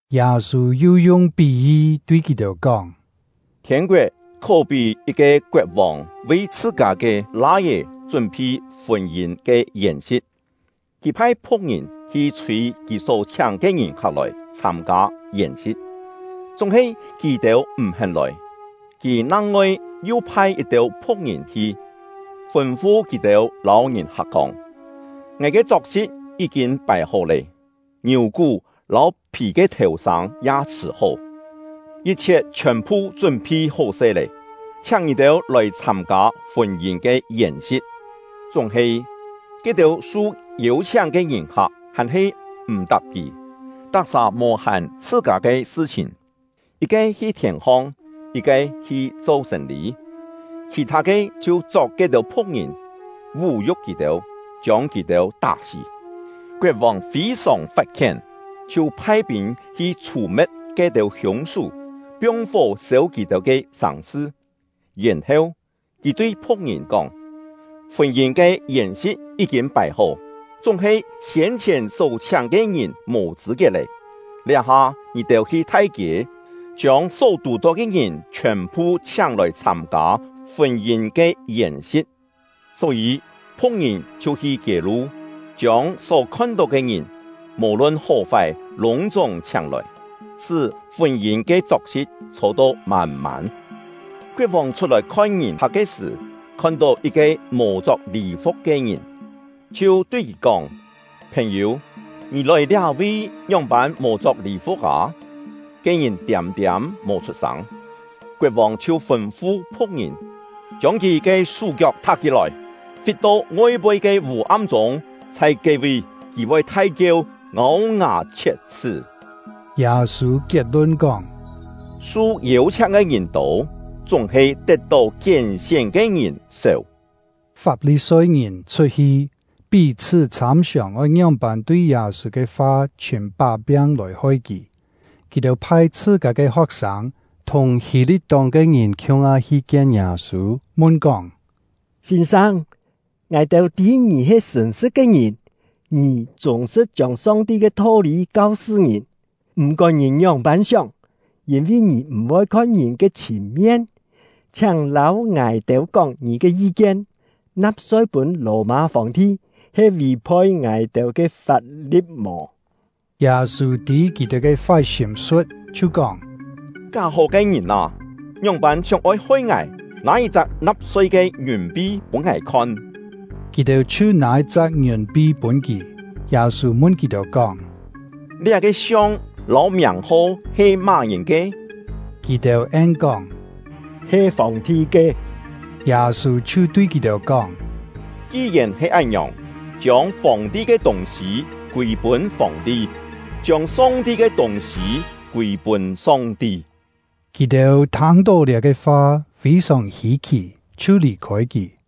Yâ-sû yu yung pí-yi tui kì-têu kóng: “Thiên-koet khó-pí yit-ke koet-vòng vi chhṳ-kâ ke lai-é chún-phi fûn-yîn ke yèn-si̍t. Kì phai phu̍k-ngìn hi chhûi kì só chhiáng ke ngìn-hak lòi chhâm-kâ yèn-si̍t, chúng-he kì-têu m̀-hén lòi. Kì nang-ngoi yu phai yit-têu phu̍k-ngìn hi, fûn-fu kì-têu lâu ngìn-hak kóng: ‘Ngài ke chok-si̍t yí-kîn pài-hó lé, ngiù-kú lâu phì ke thèu-sâng ya chhṳ̀-hó, yit-chhiet chhiòn-phu chún-phi hó-se lé, chhiáng ngì-têu lòi chhâm-kâ fûn-yîn ke yèn-si̍t.’ Chúng-he, ke-têu su yêu-chhiáng ke ngìn-hak hàn-he m̀-tap kì, tak-sà mò-hàn chhṳ-kâ ke sṳ-chhìn: Yit-ke hi thièn-hong, yit-ke hi cho sên-lî, khì-thâ ke chhiu chok ke-têu phu̍k-ngìn, vú-yu̍k kì-têu, chiông kì-têu tá-sí. Koet-vòng fî-sòng fat-khién, chhiu phai pîn hi chhù-me̍t ke-têu hiûng-sú, piong-fó sêu kì-têu ke sàng-sṳ. Yèn-heu, kì tui phu̍k-ngìn kóng: ‘Fûn-yîn ke yèn-si̍t yí-kîn pài-hó, chúng-he siên-chhièn só chhiáng ke ngìn mò chṳ̂-kiet lé. Liá-ha ngì-têu hi thai-kiê, chiông só tù-tó ke ngìn chhiòn-phu chhiáng-lòi chhâm-kâ fûn-yîn ke yèn-si̍t.’ Só-yî phu̍k-ngìn chhiu hi kiê-lu, chiông só khon-tó ke ngìn, mò-lun hó-fái lûng-chúng chhiáng-lòi, sṳ́ fûn-yîn ke chok-si̍t chhô-to mân-mân. “Koet-vòng chhut-lòi khon ngìn-hak ke sṳ̀, khon-tó yit-ke mò chok lî-fu̍k ke ngìn, chhiu tui kì kóng: ‘Phèn-yû, ngì lòi liá-vi, ngióng-pân mò chok lî-fu̍k â?’ Ke ngìn tiâm-tiâm mò chhut-sâng. Koet-vòng chhiu fûn-fu phu̍k-ngìn: ‘Chiông kì ke sú-kiok thak-hí-lòi, fit-to ngoi-poi ke vû-am-chûng. Chhai ke-vi, kì voi thai-kieu, ngâu-ngà chhiet-chhṳ́.’” Yâ-sû kiet-lun kóng: “Su yêu-chhiáng ke ngìn tô, chúng-he tet-tó kién-sién ke ngìn séu!” Fap-li-soi-ngìn chhut-hi, pí-chhṳ́ chhâm-siòng oi ngióng-pân tui Yâ-sû ke fa chhìm pá-piang lòi hoi kì. Kì-têu phai chhṳ-kâ ke ho̍k-sâng, thùng Hî-li̍t-tóng ke ngìn khiung-ha hi kien Yâ-sû, mun-kóng: “Sîn-sâng, ngài-têu tî ngì he sṳ̀n-sṳ̍t ke ngìn; ngì chûng-sṳ̍t chiông Song-ti ke tho-lî kau-sṳ ngìn, m̀-kón ngìn ngióng-pân sióng, yîn-vi ngì m̀-voi khon ngìn ke chhìn-mien. Chhiáng lâu ngài-têu kóng ngì ke yi-kien: Na̍p-soi pûn Lò-mâ Fòng-ti he vì-poi ngài-têu ke fap-li̍t mò?” Yâ-sû tî kì-têu ke fái sîm-su̍t, chhiu kóng: “Ká-hó ke ngìn â, ngióng-pân sióng-oi hoi ngài? Nâ yit-chak na̍p-soi ke ngiùn-pi pûn ngài khon!” Kì-têu chhiu nâ yit-chak ngiùn-pi pûn kì. Yâ-sû mun kì-têu kóng: “Liá-ke siong lâu miàng-ho he má-ngìn ke?” Kì-têu en-kóng: “He Fòng-ti ke.” Yâ-sû chhiu tui kì-têu kóng: “Ki-yèn he án-ngiòng, chiông Fòng-ti ke tûng-sî kûi-pûn Fòng-ti, chiông Song-ti ke tûng-sî kûi-pûn Song-ti.” Kì-têu thâng-tó liá-ke fa, fî-sòng hî-khì, chhiu lì-khôi kì.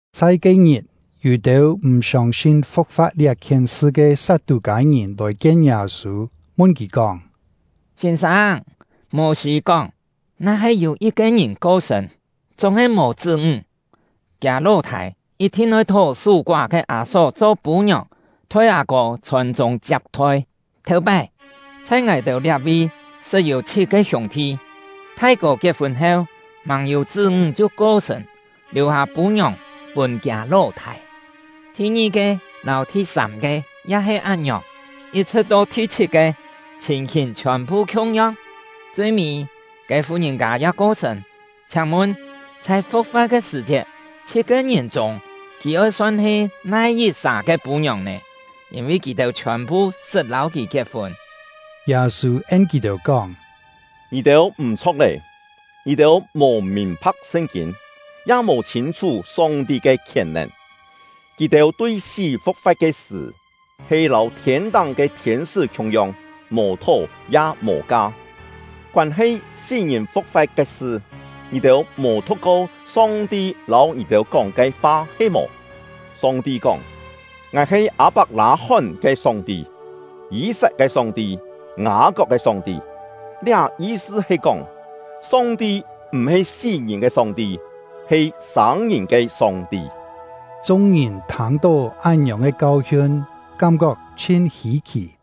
Chhai ke-ngit, yû-têu m̀ siông-sin fu̍k-fa̍t liá-khien sṳ ke Sat-tû-kâi-ngìn lòi-kien Yâ-sû, mun kì kóng: “Sîn-sâng, Mô-sî kóng: ‘Na-he yû yit-ke ngìn ko-sṳ̂n, chúng-he mò chṳ́-ńg, kiâ ló-thâi yit-thin oi thó sú-koá ke â-só cho pû-ngiòng, thoi â-kô chhòn-chûng chiap-thoi.’ Thèu-pái, chhai ngài-têu liá-vi sṳt yû chhit-ke hiûng-thi: Thai-kô kiet-fûn heu, màng yû chṳ́-ńg chhiu ko-sṳ̂n, liù-hâ pû-ngiòng pûn kiâ ló-thâi; thi-ngi-ke lâu thi-sâm-ke ya he án-ngiòng, yit-chhṳ̍t to thi-chhit-ke, chhìn-hìn chhiòn-phu khiung-yong. Chui-mî, ke fu-ngìn-kâ ya ko-sṳ̂n. Chhiáng-mun, chhai fu̍k-fa̍t ke sṳ̀-chiet, chhit-ke ngìn chûng kì oi son he nai yit-sà ke pû-ngiòng nè? Yîn-vi kì-têu chhiòn-phu sṳt lâu kì kiet-fûn.” Yâ-sû en kì-têu kóng: “Ngì-têu m̀-chho̍k lé! Ngì-têu mò mìn-pha̍k Sṳn-kîn, ya mò chhîn-chhú Song-ti ke khièn-nèn. Kì-têu tui sí fu̍k-fa̍t ke sṳ̀, he lâu thiên-táng ke thiên-sṳ́ khiung-yong, mò thó ya mò ka. Koân-he sí-ngìn fu̍k-fa̍t ke sṳ, ngì-têu mò thu̍k-ko Song-ti lâu ngì-têu kóng ke fa he-mò? Song-ti kóng: ‘Ngài he Â-pak-lâ-hón ke Song-ti, Yî-sat ke Song-ti, Ngâ-kok ke Song-ti.’ Liá yi-sṳ he kóng, Song-ti m̀-he sí-ngìn ke Song-ti, he sâng-ngìn ke Song-ti.” Chung-ngìn thâng-tó án-ngiòng ke kau-hiun, kám-kok chhin hî-khì.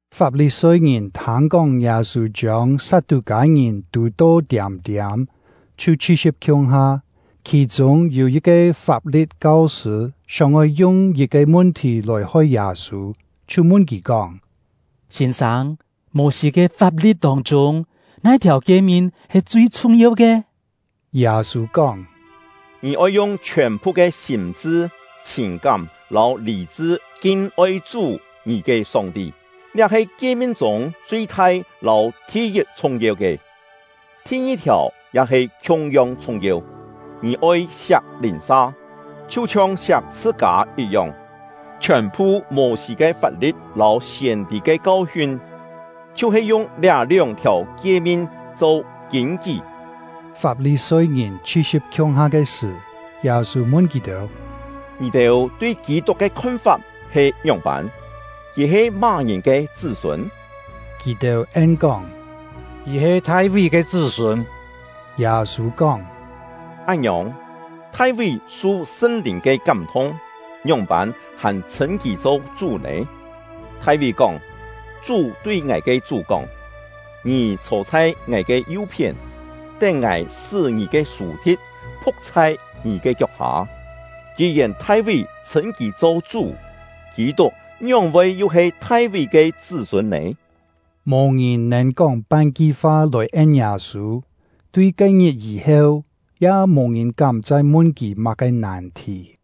Fap-li-soi-ngìn thâng-kóng Yâ-sû chiông Sat-tû-kâi-ngìn tù-to tiâm-tiâm, chhiu chhi-si̍p khiung-ha. Khì-chûng yû yit-ke Fap-li̍t kau-sṳ̂ sióng-oi yung yit-ke mun-thì lòi-hoi Yâ-sû, chhiu mun kì kóng: “Sîn-sâng, Mô-sî ke fap-li̍t tông-chûng, nai-thiàu kie-min he chui chhung-yeu ke?” Yâ-sû kóng: “ ‘Ngì oi yung chhiòn-phu ke sîm-chṳ, chhìn-kám lâu lî-chṳ kin-oi Chú — ngì ke Song-ti.’ Liá he kie-min chûng chui-thai lâu thi-yit chhung-yeu ke. Thi-ngi-thiàu ya he khiung-yong chhung-yeu: ‘Ngì oi siak lìn-sa, chhiu-chhiong siak chhṳ-kâ yit-yong.’ Chhiòn-phu Mô-sî ke fap-li̍t lâu siên-tî ke kau-hiun, chhiu-he yung liá lióng-thiàu kie-min cho kîn-kí.” Fap-li-soi-ngìn chhi-si̍p khiung-ha ke sṳ̀, Yâ-sû mun kì-têu: “Ngì-têu tui Kî-tuk ke khon-fap he ngióng-pân? Kì he má-ngìn ke chṳ́-sûn?” Kì-têu en-kóng: “Kì he Thai-ví ke chṳ́-sûn.” Yâ-sû kóng: “Án-ngiòng, Thai-ví su Sṳn-Lìn ke kám-thung, ngióng-pân hàn chhṳ̂n kì cho ‘Chú’ nè? Thai-ví kóng: Chú tui ngài ke Chú kóng: ‘Ngì chhô chhai Ngài ke yu-phién, tén Ngài sṳ́ ngì ke sù-thi̍t phu̍k chhai ngì ke kiok-hâ.’ Ki-yèn Thai-ví chhṳ̂n kì cho ‘Chú’, Kî-tuk ngióng-voi yu he Thai-ví ke chṳ́-sûn nè?” Mò ngìn nèn kóng pan-ki fa lòi en Yâ-sû. Tui ke-ngit yî-heu, ya mò ngìn kám chai mun kì má-ke nàn-thì.